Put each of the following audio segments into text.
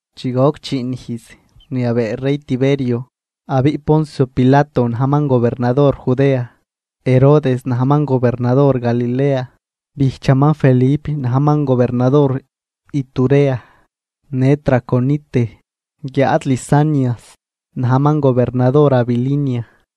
Chi goc chiin ijz rniabee rey Tiberio, abiꞌ Poncio Pilato najman gobernador Judea, Herodes najman gobernador Galilea, bijchaman Felip najman gobernador Iturea në Traconite, guiáad Lisanias najman gobernador Abilinia.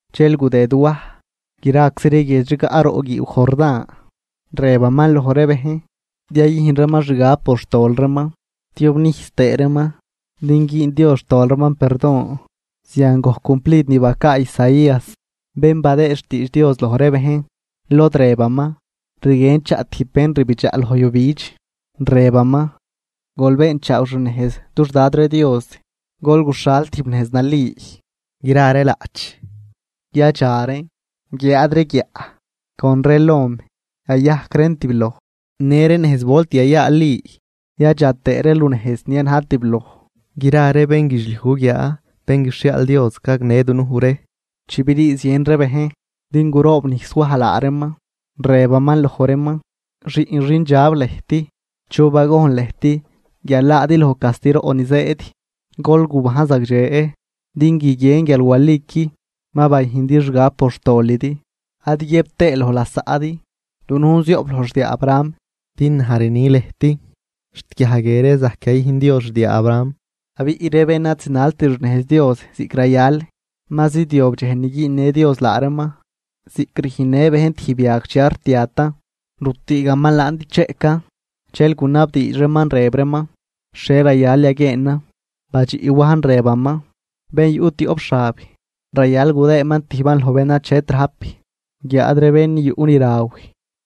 Dxel gudëd Waj graczi ree guiedx rigaꞌ roꞌ guiiw Jordán, rëbaman loj ree bejn din yayüjn reeman xgab por xtol reeman tiobnijs tëë reeman, din güün Dios xtol reeman perdon. Zian gojc cumplid ni bacaa Isaías bén badëë xtiidx Dios loj ree bejn, lod rëbaman: Rguien chaꞌ tijb bén rbidxaꞌ loj yujbidx, rëbaman: “Gol beenchaaw xnejz dux Dad ree Dios, gol guxhal tijb nejz nali. Gra ree laꞌch yadxa reen guiáad ree guiaꞌ con ree lom yayajc reen tibloj, në ree nejz volt yayaali yadxa tëë ree lunejz ni ad najt tibloj. Gra ree bénguidxliuj guguiaa bén guixhiaal Dios gagnë dunuj ree.” Chi brii zien ree bejn din guroobnijs Waj laa reeman, rëbaman loj reeman: ―¡Xiꞌn xindxab lëjt! ¿Chu bagojn lëjt guial laadi loj castiroꞌ ni zëëd? Gol gubajn zagdxe din guiguien guial waliqui ma bayüjndi xgab por xtolidi, ad guiëb tëë loj lasaꞌdi: “Dunujn zioꞌp loj xdiaa Abraham”, din naj rni lëjt xt guiaj guie ree zajc yayüjn Dios xdiaa Abraham. Abiꞌ ree bén ad zinalt xnejz Dios ziꞌc rayal, ma zidyob dxej ni güünnë Dios laa reeman ziꞌc rüjnnë bejn tijb yag chi ad rtiatan, rütüügaman laan din cheꞌcan. Dxel gunabdiidx reeman, rëb reeman: ―¿Xhie rayal yaguieenan? Badxiꞌ Wajn rëbaman: ―Bén yuꞌ tioꞌp xab, rayal gudëëman tijban loj bén achet rajp. Guiáad bén yuꞌ ni raw,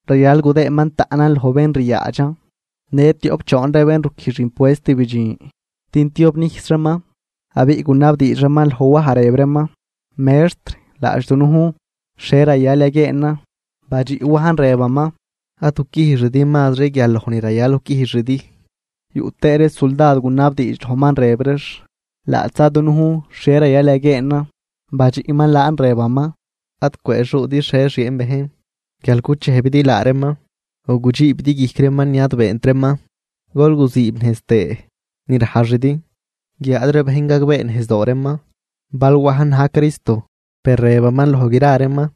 rayal gudëëman taꞌnan loj bén ryaadxan. Në tioꞌp choon ree bén ruquijx impuest bidxin din tiobnijs reeman. Abiꞌ gunabdiidx reeman loj Waj, rëb reeman: ―Mextr, laadx dunujn, ¿xhie rayal yaguieenan? Badxiꞌ Wajn, rëbaman: ―Ad guquijxidi mazri guial loj ni rayal guquijxidi. Yuꞌ tëë ree suldad gunabdiidx lojman rëb reex: ―Laadxza dunujn, ¿xhie rayal yaguieenan? Badxiꞌman laan rëbaman: ―Ad cwëëxuudi xhie xieen bejn, guial guchejbidi laa reeman o gudxiibidi guijc reeman ni ad beent reeman, gol guziibnejz tëë ni rajxidi. Guiáad ree bejn gagbeenejzdoo reeman bal Wajn na̱j Cristo, per rëbaman loj gra reeman: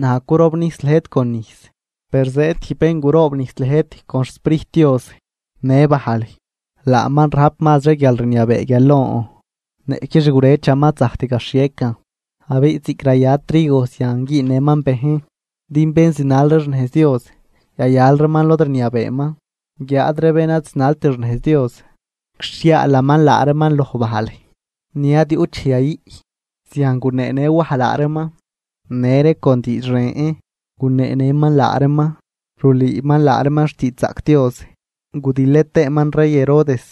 ―Naj curobnijs lëjt con nijs. Per zëëd tijb bén guroobnijs lëjt con xSprijt Dios në bajl. Laaman rajp mazri guialrniabee guial lon, niꞌqui xgurëchaman ad zajct gaxhiecan. Abiꞌ ziꞌc raya trigo zian güünnëman bejn. Din bén zinal ree xnejz Dios yayal reeman lod rniabeeman, guiáad ree bén ad zinalt xnejz Dios guixhiaalaman laa reeman loj bajl ni ad yuꞌt dxej yayüꞌ. Zian guneenë Waj laa reeman, në ree con diidx ren guneenëman laa reeman rulüüman laa reeman xtiidxzaꞌc Dios. Gudilë tëëman rey Herodes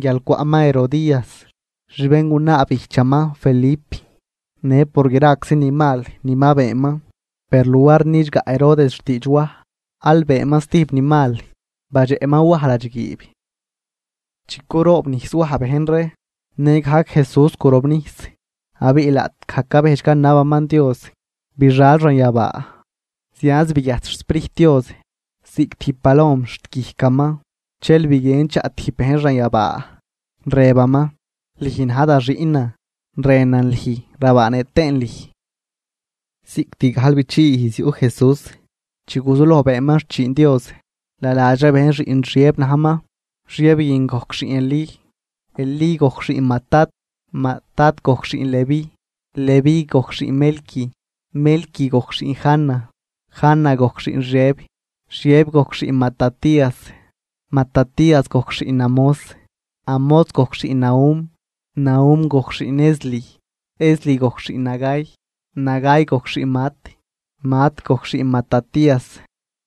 guial cwaꞌman Herodías xbéngunaa bijchaman Felip, në por graczi ni mal ni ma beenman. Per luar nidxgaꞌ Herodes xtiidx Waj aal beenman zatijb ni mal: badxeꞌman Waj ladxguiib. Chi curoobnijs Waj bejn ree nëgajc Jesús gurobnijs. Abiꞌ laꞌtgaj cabejdx canabaman Dios, bixal xanyabaa zianz biguiajt xSprijt Dios ziꞌc tijb palom xt guijcaman. Dxel biguien chaꞌ tijb bejn xanyabaa, rëbaman: ―Lüj na̱j da xiꞌnan, rënan lüj rabaanëꞌ tëën lüj. Cost gajlbichii ijz yuꞌ Jesús chi guzuloj beenman xchiin Dios. Naladx ree bejn xiꞌn Xiëb najman, Xiëb guin gojc xiꞌn Elí. Elí gojc xiꞌn Matat, Matat gojc xiꞌn Leví, Leví gojc xiꞌn Melqui, Melqui gojc xiꞌn Jana, Jana gojc xiꞌn Xiëb, Xiëb gojc xiꞌn Matatías, Matatías gojc xiꞌn Amós, Amós gojc xiꞌn Nahum, Nahum gojc xiꞌn Esli, Esli gojc xiꞌn Nagai, Nagai gojc xiꞌn Maat, Maat gojc xiꞌn Matatías,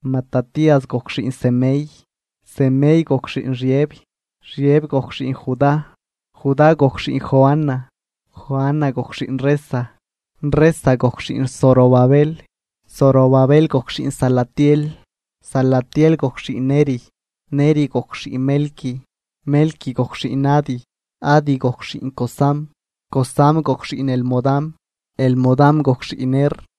Matatías gojc xiꞌn Semei, Semei gojc xiꞌn Xiëb, Xiëb gojc xiꞌn Judá, Judá gojc xiꞌn Joana, Joana gojc xiꞌn Resa, Resa gojc xiꞌn Zorobabel, Zorobabel gojc xiꞌn Salatiel, Salatiel gojc xiꞌn Neri, Neri gojc xiꞌn Melqui, Melqui gojc xiꞌn Adi, Adi gojc xiꞌn Cosam, Cosam gojc xiꞌn Elmodam, Elmodam gojc xiꞌn Er,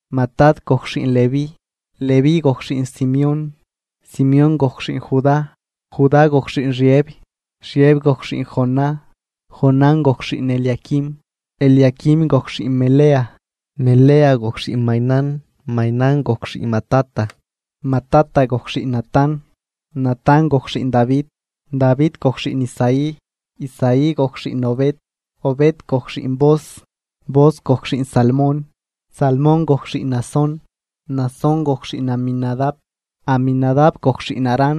Matat gojc xiꞌn Leví, Leví gojc xiꞌn Simeón, Simeón gojc xiꞌn Judá, Judá gojc xiꞌn Xiëb, Xiëb gojc xiꞌn Jonán, Jonán gojc xiꞌn Eliaquim, Eliaquim gojc xiꞌn Melea, Melea gojc xiꞌn Mainán, Mainán gojc xiꞌn Matata, Matata gojc xiꞌn Natán, Natán gojc xiꞌn Davi, Davi gojc xiꞌn Isaí, Isaí gojc xiꞌn Obed, Obed gojc xiꞌn Booz, Booz gojc xiꞌn Salmón, Salmón gojc xiꞌn Naasón, Naasón gojc xiꞌn Aminadab, Aminadab gojc xiꞌn Aram,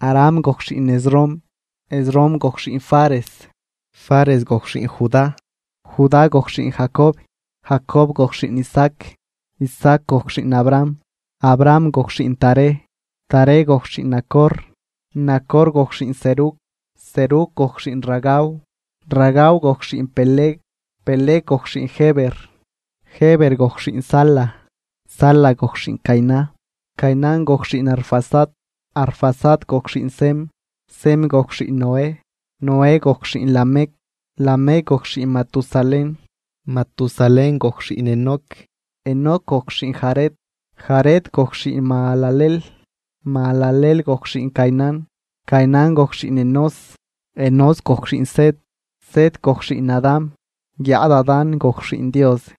Aram gojc xiꞌn Esrom, Esrom gojc xiꞌn Fares, Fares gojc xiꞌn Judá, Judá gojc xiꞌn Jacob, Jacob gojc xiꞌn Isaac, Isaac gojc xiꞌn Abraham, Abraham gojc xiꞌn Taré, Taré gojc xiꞌn Nacor, Nacor gojc xiꞌn Serug, Serug gojc xiꞌn Ragau, Ragau gojc xiꞌn Peleg, Peleg gojc xiꞌn Heber, Heber gojc xiꞌn Sala, Sala gojc xiꞌn Cainán, Cainán gojc xiꞌn Arfaxad, Arfaxad gojc xiꞌn Sem, Sem gojc xiꞌn Noé, Noé gojc xiꞌn Lamec, Lamec gojc xiꞌn Matusalén, Matusalén gojc xiꞌn Enoc, Enoc gojc xiꞌn Jared, Jared gojc xiꞌn Mahalaleel, Mahalaleel gojc xiꞌn Cainán, Cainán gojc xiꞌn Enós, Enós gojc xiꞌn Set, Set gojc xiꞌn Adán, guiáad Adán gojc xiꞌn Dios.